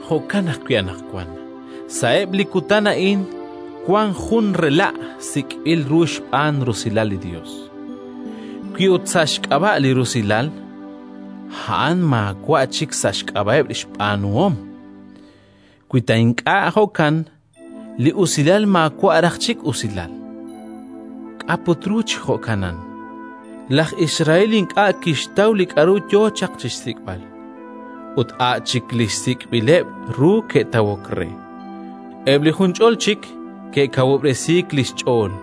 Jo'kan ajwi' anaqwan, sa'eb' li kutan a'in, wank jun “rela'” sik'b'il ru xb'aan rusilal li Yos. Wi ut sa' xk'ab'a' li rusilal, a'an maawa' chik sa' xk'ab'a'eb' xb'aanuhom; wi ta ink'a' jo'kan, li usilal maawa' raj chik usilal. K'a' put ru chi jo'kanan? Laj Israel ink'a' kixtaw li k'aru yo chaq chi xsik'b'al; ut a' chik li sik'b'ileb' ru ke'tawok re. Eb' li junch'ol chik ke'kawub'resiik li xch'ool,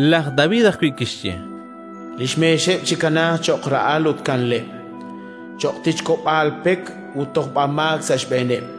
Laj David ajwi' kixye: “Li xmeexeb' chikanaaq cho'q ra'al ut kanleb', cho'q tichk'ob'aal pek ut tojb'amaak sa' xb'eeneb'.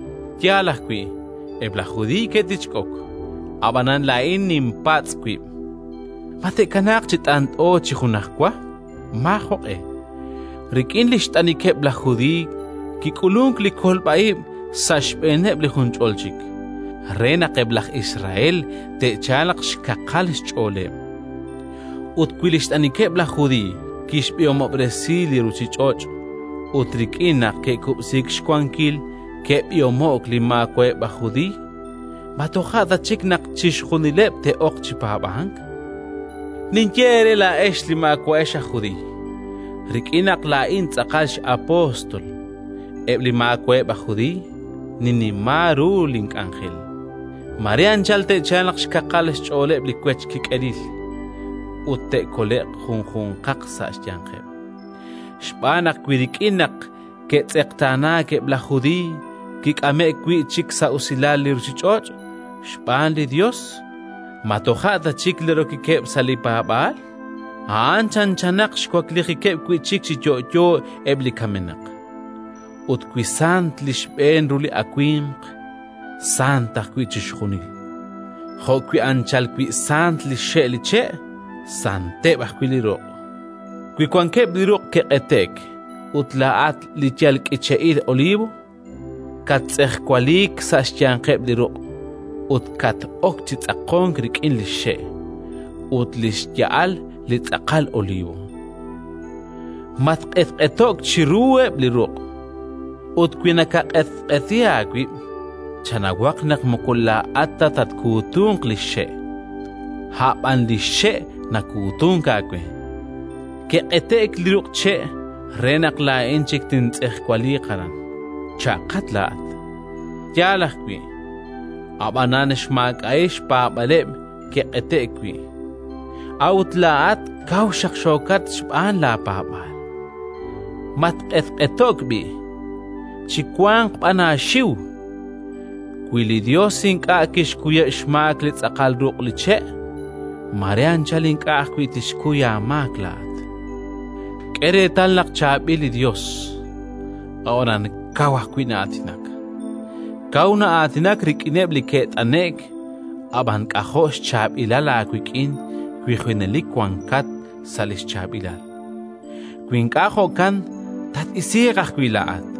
Yaal ajwi', eb' laj Judiiy ke'tichk'ok; ab'anan laa'in ninpatz' wib': Ma te'kanaaq chi t'ant'o chi junajwa? Maajoq'e. Rik'in li xt'anikeb' laj Judiiy kik'ulunk li kolb'a ib' sa' xb'eeneb' li junch'ol chik, re naq eb' laj Israel te'chalq xkaqal xch'ooleb'. Ut wi li xt'anikeb' laj Judiiy kixb'ihomob'resi li ruuchich'och' ut rik'in naq ke'kub'siik xwankil ke'b'ihomo'k li maawa'eb' aj Judiiy, ma toja' ta chik naq chixjunileb' te'ok chi paab'ank? Ninye eere laa'ex li maawa'ex aj Judiiy: rik'in naq laa'in tz'aqal x'apóstol eb' li maawa'eb' aj Judiiy, ninnima ru link'anjel. Mare anchal te'chalq xkaqal xch'ooleb' li wech kik'elil ut te'kole'q junjunqaq sa' xyanqeb'. Xb'aan naq wi rik'in naq ke'tz'eqtaanaak eb' laj Judiiy, kik'ame'k wi' chik sa' usilal li ruuchich'och' xb'aan li Yos, ma toja' ta chik li rokikeb' sa' li paab'aal? A'an chanchanaq xwaklijikeb' wi' chik chi yo'yo eb' li kamenaq! Ut wi sant li xb'een ru li awimq, sant ajwi' chixjunil. Jo'wi' anchal wi sant li xxe' li che', santeb' ajwi' li ruq'. Wi wankeb' li ruq' ke'q'ete'k, ut laa'at li yal k'iche'il olivo kattz'ejwaliik sa' xyanqeb' li ruq' ut kat-ok chi tz'aqonk rik'in li xxe' ut li xya'al li tz'aqal olivo, matq'etq'eto'k chiruheb' li ruq'. Ut wi nakaq'etq'eti aawib', chanawaq naq moko laa'at ta nakatkuutunk li xe', a' b'an li xe' nakuutunk aawe. “Ke'q'ete'k li ruq' che' re naq laa'in chik tintz'ejwaliiq aran”, cha'qat laa'at. Yaal ajwi', ab'anan xmaak'a'il xpaab'aaleb' ke'q'ete'k wi'; a'ut laa'at kaw xaqxookat xb'aan laapaab'aal. Matq'etq'eto'k b'i', chiwanq b'an aaxiw. Wi li Yos ink'a' kixkuyeb' xmaak li tz'aqal ruq' li che', mare anchal ink'a' ajwi' tixkuy aamaak laa'at. K'e reetal naq chaab'il li Yos, ab'anan kaw ajwi' na'aatinak. Kaw na'aatinak rik'ineb' li ke't'ane'k, ab'an k'ajo' xchaab'ilal aawik'in wi junelik wanqat sa' li xchaab'ilal. Wi ink'a' jo'kan, tat-isiiq ajwi' laa'at.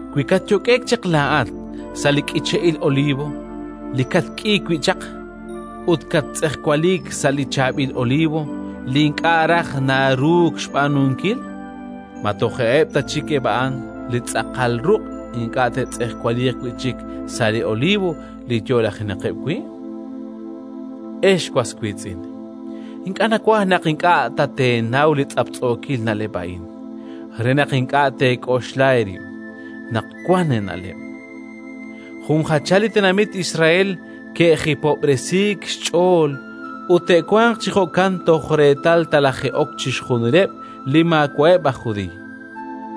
Wi katyok'e'k chaq laa'at sa' li k'iche'il olivo li katk'iik wi' chaq, ut kattz'ejwaliik sa' li chaab'il olivo li ink'a' raj naruuk xb'aanunkil, ma toja'eb' ta chik eb' a'an li tz'aqal ruq' ink'a' te'tz'ejwaliiq wi' chik sa' li olivo li yo'lajenaqeb' wi'? Ex was wiitz'in, ink'a' nawaj naq ink'a' ta teenaw li tz'aptz'ookil na'leb' a'in, re naq ink'a' teek'oxla eerib' naq wank eena'leb': jun jachal li tenamit Israel ke'jipob'resiik xch'ool, ut te'wanq chi jo'kan toj reetal talaje'ok chixjunileb' li maawa'eb' aj Judiiy.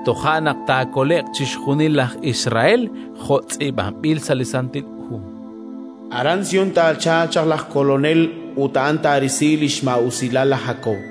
Toja' naq taakole'q chixjunil laj Israel, jo' tz'iib'anb'il sa' li Santil Hu: “Aran Sión taachalq chaq laj Kolonel ut a'an taarisi li xmaa'usilal laj Jakob.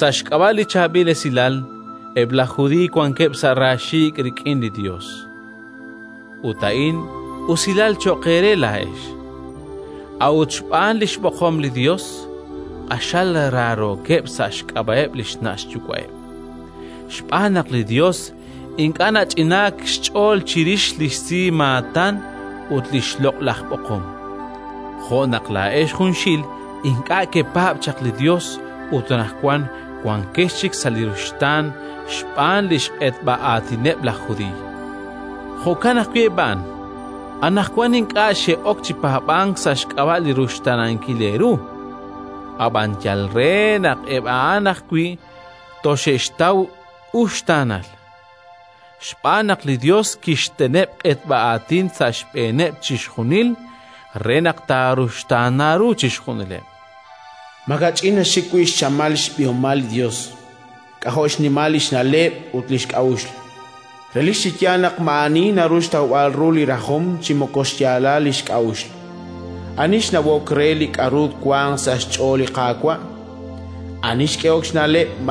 Sa' xk'ab'a' li Chaab'il Esilal, eb' laj Judiiy wankeb' sa' raaxiik' rik'in li Yos (ut a'in usilal cho'q eere laa'ex); a'ut xb'aan li xb'oqom li Yos, q'axal raarookeb' sa' xk'ab'a'eb' li xna' xyuwa'eb'. Xb'aan naq li Yos ink'a' nach'inank xch'ool chirix li xsimaatan ut li xloq'laj b'oqom. Jo' naq laa'ex junxil ink'a' kepaab' chaq li Yos ut anaqwan wankex chik sa' li ruxtaan xb'aan li xq'etb'a aatineb' laj Judiiy, jo'kan ajwi' eb' a'an: anaqwan ink'a' xe'ok chi paab'ank sa' xk'ab'a' li ruxtaanankil eeru, ab'an yal re naq eb' a'an ajwi' toxe'xtaw uxtaanal. Xb'aan naq li Yos kixteneb' q'etb'a aatin sa' xb'eeneb' chixjunil, re naq taaruxtaana ru chixjunileb'. Makach'in naxik wi' xchamal xb'ihomal li Yos! K'ajo' xnimal li xna'leb' ut li xk'a'uxl! Relik chi yaal naq maa'ani naru xtawb'al ru li rajom chi moko xyaalal li xk'a'uxl! Ani xnawok re li k'aru wank sa' xch'ool li Qaawa'? Ani xk'ehok xna'leb'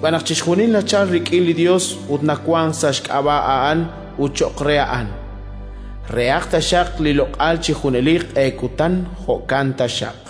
Xb'aan naq chixjunil nachalk rik'in li Yos ut nawank sa' xk'ab'a' A'an ut cho'q re A'an. Rehaq taxaq li loq'al chi junelik q'e kutan! Jo'kan taxaq.